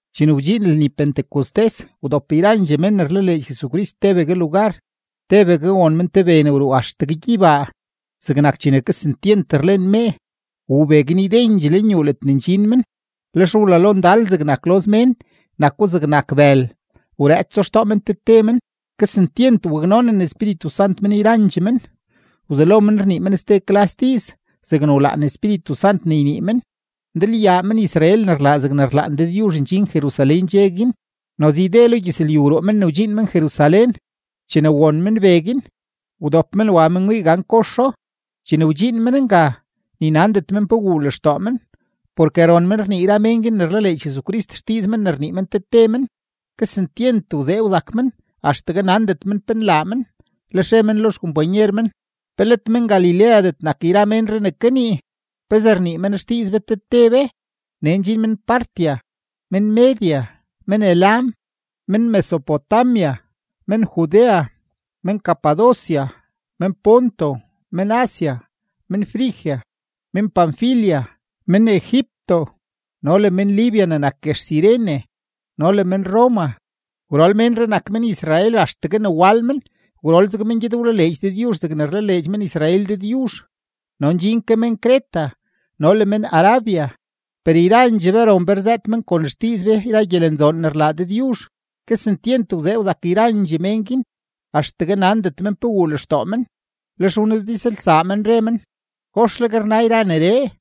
Chene wdxiin lni Pentecostés, wdop yrandxee mén ne rlaleedx Jesucrist tebegue lugar. Tebegue won men te be ne wruu axtegue gyeybaa, zegnak chene kesentyent rlen mee, wuu be guin ydendxee lenyuu ledne ndxin men. Lex wlalo ndal zegnak loz mén, nako zegnak bël, wrëëtso xtoo men te te men. Kesentyent waknonen Espíritu Sant men yrandxee men, wzelo men rnii men ste klas diiz zegne wlaan Espíritu Sant ne ynii men. Ndalyaa men-Israel ne rlaa zegne rlaan Dëdyuzh ndxin Jerusalén dxe guin; noze yde lo gyëzlyu wruu men wdxiin men Jerusalén. Chene won men be guin, wdop men wa men wii gan koxo. Chene wdxiin men nga, ni nandet men pe wuu lextoo men, porke ron men rnii yra mén guin ne rlaleedx Jesucrist xdiiz men ne rnii men te te men. Kesentyent wzee wzak men axtegue nandet men pe nlaa men, lex re men lo xkompanyer men: ―¿Pe let men-Galileadet nak yra ménree ne kanii? ¿Pezee rnii men xdiiz be te te be? Nee ndxin men-Partia, men-Media, men-Elam, men-Mesopotamia, men-Judea, men-Capadocia, men-Ponto, men-Asia, men-Frigia, men-Panfilia, men-Egipto, no le men-Libia ne nak guex Cirene, no le men-Roma. Gwrol ménree nak men-Israel axtegue ne wal men. Gwrol zeg men gyed wlaleedx Dëdyuzh zegne rlaleedx men-Israel Dëdyuzh. No ndxin ke men-Creta no le men-Arabia. ¡Per yrandxee be ron be rzëët men kon xdiiz be yra gyelenzoon ne rlaa Dëdyuzh! Kesentyent wzee wzak yrandxee mén guin axtegue nandet men pe wuu lextoo men, lex wnabdizlsaa men, re men: ―¿Goxleg rna yra neree?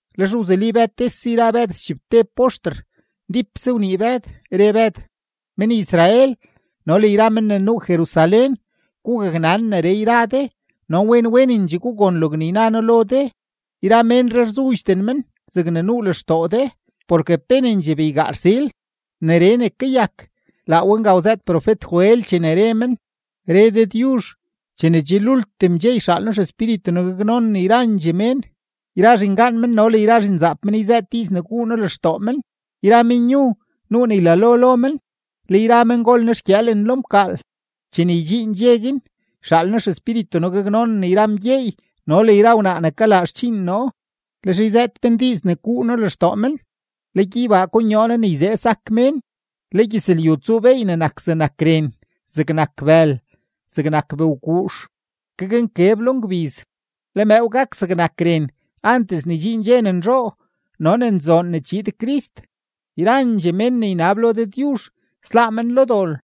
Lex wzuli Bëd tese yra Bëd schibteb poxter, ndípse wnii Bëd, re Bëd: ―Men-Israel no le yra mén ne nuu Jerusalén, gugaknan neree yra de no wen wenendxee gugon logne yna noo lo de. Yra ménree rzudxden men zegne nuu lextoo de, porke penendxee beygaa rsil. Neree ne kayak, laa we nga wzëët profet-Joel chene re men: Re Dëdyuzh: “Chene che lultim dxe yxaal noo XEspíritu noo gaknonen yrandxee mén. Yra zhingaan men no le yra zhinzaap men yzëët diiz ne guu noo lextoo men; yra menyu, nuu ne ylalo lo men; le yra mengol nexgyëëlen lo mkaal. Chene ydxiin dxe guin, yxaal noo XEspíritu noo gaknonen yra mgyeey no le yra wnaa ne kalaa xdxiin noo, lex yzëët men diiz ne guu noo lextoo men. Le gyeybaa konyoo noo ne yzee sak mén, le gyëzlyu tsuu beey ne nak zegnak ren, zegnak bël, zegnak bëwguux. Gaknkeb lo ngbiz, le mëëw gak zegnak ren antes ne ydxiin dxe ne nzhoo no ne nzoon ne chiid Crist. Yrandxee mén ne ynab lo Dëdyuzh, sláá men lo dol.”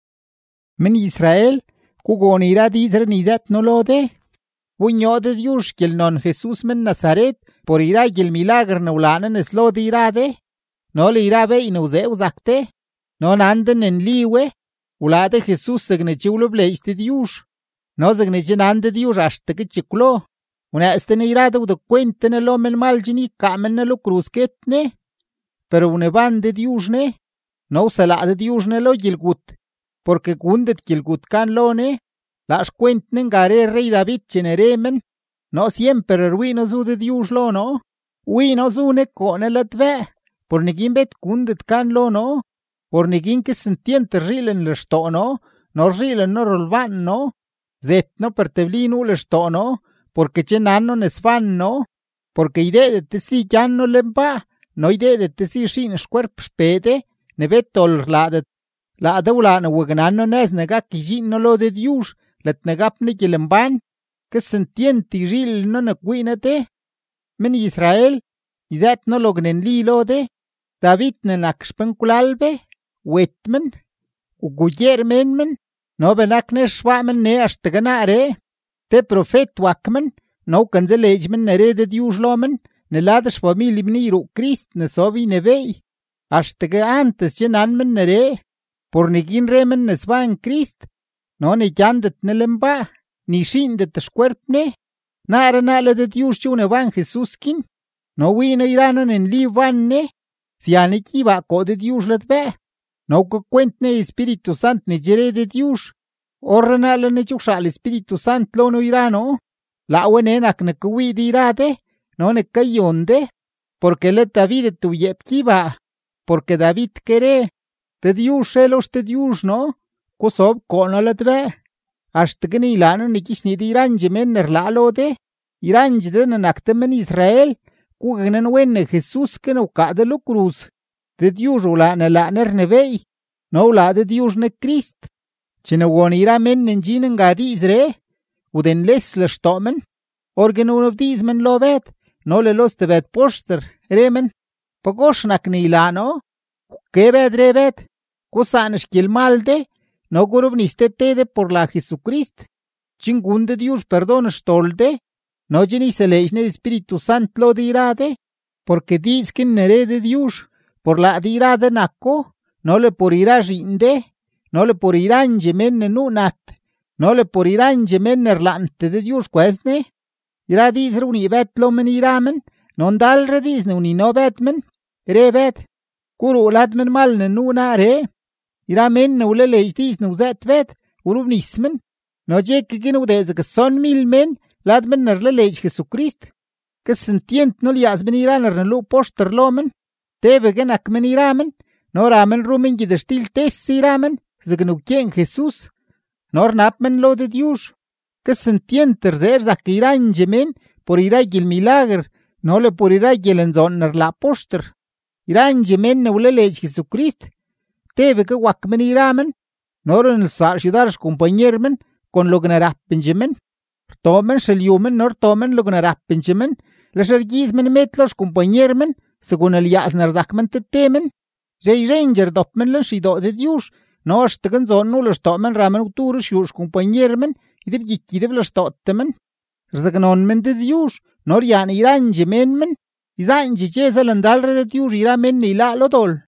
’Men-Israel, gugon yra diizree ne yzëët noo lo de: Wbonyoo Dëdyuzh xgyelnon Jesus men-Nazaret por yra gyelmilaguer ne wlaa Ne nes lo de yra de no le yra beey ne wzee wzak de, no nan de ne nli we. Wlaa de Jesus zegne che wlebleedx Dëdyuzh no zegne che nan Dëdyuzh axtegue chekwlo. Wnëëz de Ne yra de wdekwent de Ne lo menmal chen ykaa men Ne lo kruz guet Ne. Per wneban Dëdyuzh Ne no wselaa Dëdyuzh Ne lo gyelgut, porke gundet gyelgut gan lo Ne. Laa xkwent Ne nga re rrey-David chene re men: Noo syemper rwii noo zu Dëdyuzh lo noo; wii noo zu Ne koo noo ladbëë; por neguin bet gundet gan lo noo. Por neguin kesentyent rzhiilen lextoo noo no rzhiilen noo rolbaan noo, zet noo, per tebli nuu lextoo noo, porke che nan noo ne sban noo, porke ydeedet de si gyan noo lenbaa no ydeedet de si xiin xkwerp XPee de ne bet dol rlaadet. Laa de wlaa ne waknan noo nëz ne gak ydxiin noo lo Dëdyuzh ledne gap noo gyelembán. Kesentyent yzhiilen noo ne kwii noo de. ’Men-Israel, yzëët noo logne nli lo de: David ne nak xpenkwlal be, wet men, wgugyeer mén men, no benak nex xbaa men nee axtegue naaree. Te profet wak men no wkanzaleedx men ne re Dëdyuzh lo men ne lad xfamilye men yruu Crist ne sob ynebééy. Axtegue antes che nan men neree; por neguin re men ne sban Crist no ne gyandet Ne lenbaa, ni xiindet xkwerp Ne. Naaree naa le Dëdyuzh che wneban Jesus guin; no wii noo yra noo ne nli wban Ne. Sya Ne gyeybaa koo Dëdyuzh ladbëë no wkakwent Ne Espíritu Sant ne che re Dëdyuzh; orrenaa le Ne che wxaal Espíritu Sant lo noo yra noo; laa we nee nak ne kawii de yra de no ne kayon de. Porke let Davidet wyeep gyeybaa, porke David ke re: Dëdyuzh re lo XDëdyuzh noo: “Gusob koo noo ladbëë axtegue ne ylaa noo ne gyichnii de yrandxee mén ne rlaa lo de.” ’Yrandxee de ne nak de men-Israel, gugaknanwen ne Jesus ke ne wkaa de lo kruz, Dëdyuzh wlaa ne laa Ne rnebééy no wlaa Dëdyuzh Ne Crist. Chene won yra mén ne ndxin nga diizree, wdenles lextoo men. Orguin wnabdiiz men lo Bëd no le lo stebëd poxter, re men: ―¿Pagox nak ne ylaa noo? Wke Bëd, re Bëd: ―Gusaan xgyelmal de no gurobnis te te de por la Jesucrist, chen gun Dëdyuzh perdon xdol de no chen yseleedx Ne Espíritu Sant lo de yra de. Porke diiz guin ne re Dëdyuzh, por laa de yra de nako no le por yra zhiin de no le por yrandxee mén ne nuu nat no le por yrandxee mén ne rlaantee Dëdyuzh kwëz Ne. Yra diizree wnii Bëd lo men yra men no ndalre diiz ne wnino Bëd men, re Bëd: ―¡Guruu lad menmal ne nuu naaree! Yra mén ne wlaleedx diiz ne wzëët Bëd, wrobnis men. No dxe ke guin wdee zeg stsonmil mén lad men ne rlaleedx Jesucrist. Kesentyent nulyaaz men yra ne rneluu poxter lo men, tebegue nak men yra men no ra men ru men gyëtxtil tese yra men zegne wkyeen Jesus no rnab men lo Dëdyuzh. Kesentyent rzee rzak yrandxee mén por yra gyelmilaguer no le por yra gyelenzoon ne rlaa poxter. Yrandxee mén ne wlaleedx Jesucrist, tebegue wak men yra men no runelsaa xyudar xkompanyer men kon logne rapendxee men. Rtoo men xelyu men no rtoo men logne rapendxee men, lex rgyiiz men med lo xkompanyer men segun lyaaz ne rzak men te te men. Yzhe yzhendxee rdop men lenxeydoo Dëdyuzh no axtegue nzoon nuu lextoo men ra men gwdu ruxyuu xkompanyer men ydebgyiky ydeblextootee men. Rzaknon men Dëdyuzh, no ryaan yrandxee mén men. Yzaandxee dxe zalandalre Dëdyuzh yra mén ne yláá lo dol.